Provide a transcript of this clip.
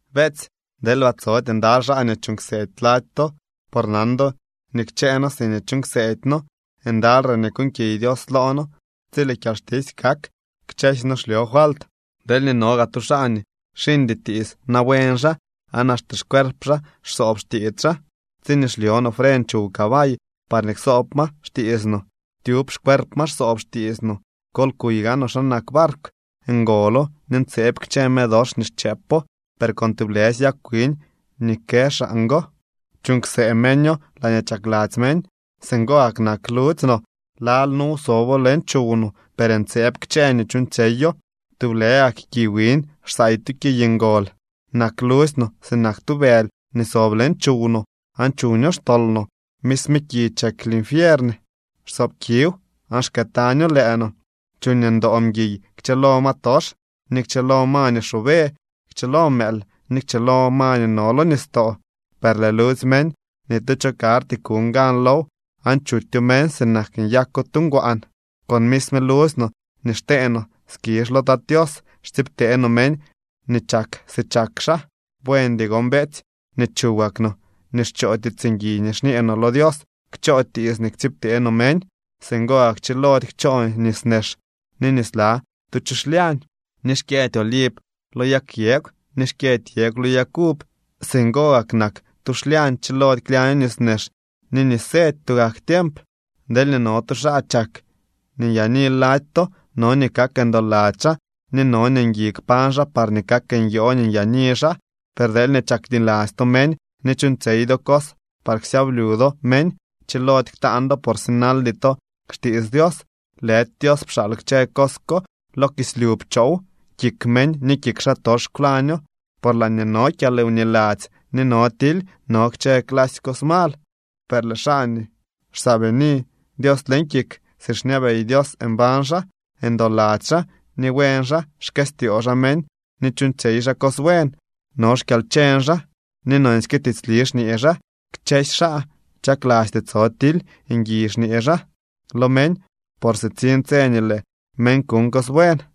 Beetsy, deelba tsody ndaly xaa nii chuuñ kseedy lady to, por nan do nii kchëë noo siñee chuuñ kseedy noo, ndaly re nii kuuñkiy Dios loo noo tsi lëë kyalxtisy kak. Kchësy no xlyo falt. Deelñee no gaa tu xaa nii xiñdy tiits na buen xaa, aan axte xcuerp xaa xsoob xtiits xaa. Tsiñee xlyo no fren chuw cabay parñee ksoob ma xtiits no, tyub xcuerp ma xsoob xtiits no. Kol kuy gaanoo xa nak barkw. Ngolo ni ntseeb kchë me dox nii xchëëpo. Per con tublësy yag wiñ nii kë xaan go chuuñ ksëë meño laañee chakladzy meñ. Singo gak nak ludzy no. Lal nuw sobo leñ chuw no, per ntseeb kchë nii chuuñtsyeyo. ¡Tublë gak ki wiñ xsaay tu kiy ngol! Nak ludzy no sinak tu bëly nii sob leñ chuw no, aan chuño xtol no. Misme ki chek linfiern. Xsoob kiw, aan xkëëtaño lëë no. Chuuñ ndoo mguiy kchëlo ma tox, ni kchëlo ma nii xoobe, kchëlo mëël, ni kchëlo ma nii no lo nistoo. Per lëë ludzy meñ ni tu cho karty kuñ gan low aan chutyo meñ sinak nii nyako tu ngwaan. Con misme ludzy no nii xtee no skizh lo Tat Tios, xtsiibtee no meñ nii chak si chak xaa. Buendy gon, beetsy, nii chuwak no nii xchoo tiits ngui nii xñee no lo Dios kchoo tiits nii ktsiibtee no meñ. Singo gak chilody kchoo nis nex ni nisnla tu chu xlyañ. Ni xkyëdy oliv lo yag yegw, ni xkyëdy yegw lo yag uv. Singo gak nak tu xlyañ. Chilody klyaño nis nex ni nis sety tugak tiemp. Deelñee no tu xaa chak ni nyaani lady to, no nii kak ndoladzy xaa ni no nii ngui kpañ xaa parñee kak nyoo nii nyaani xaa. Per deelñee chakniladzy to meñ ni chuuñtsyey do cos par ksyablyu do meñ, chilody ktaan do por sinaldy to xtiits Dios. Lëdy Dios pxaal kchë cos ko, lo kislyu pchoow, kik meñ ni kik xaatox kwlaño. Por laañee no kyalwniladzy ni no tily no kchë clasy cos mal. Per lëë xaa nii xsaabini Dios leñ kik, si xñabey Dios mbañ xaa, ndoladzy xaa ni buen xaa. Xkëstyoo xaa meñ ni chuuñtsyey xaa cos buen. No xkyalcheñ xaa ni nonsyke tiitsli xñee xaa. Kchësy xaa chaklasty tso tily, ngui xñee xaa lo meñ por sitsiñ tse nii lëë meñ kuñ cos buen.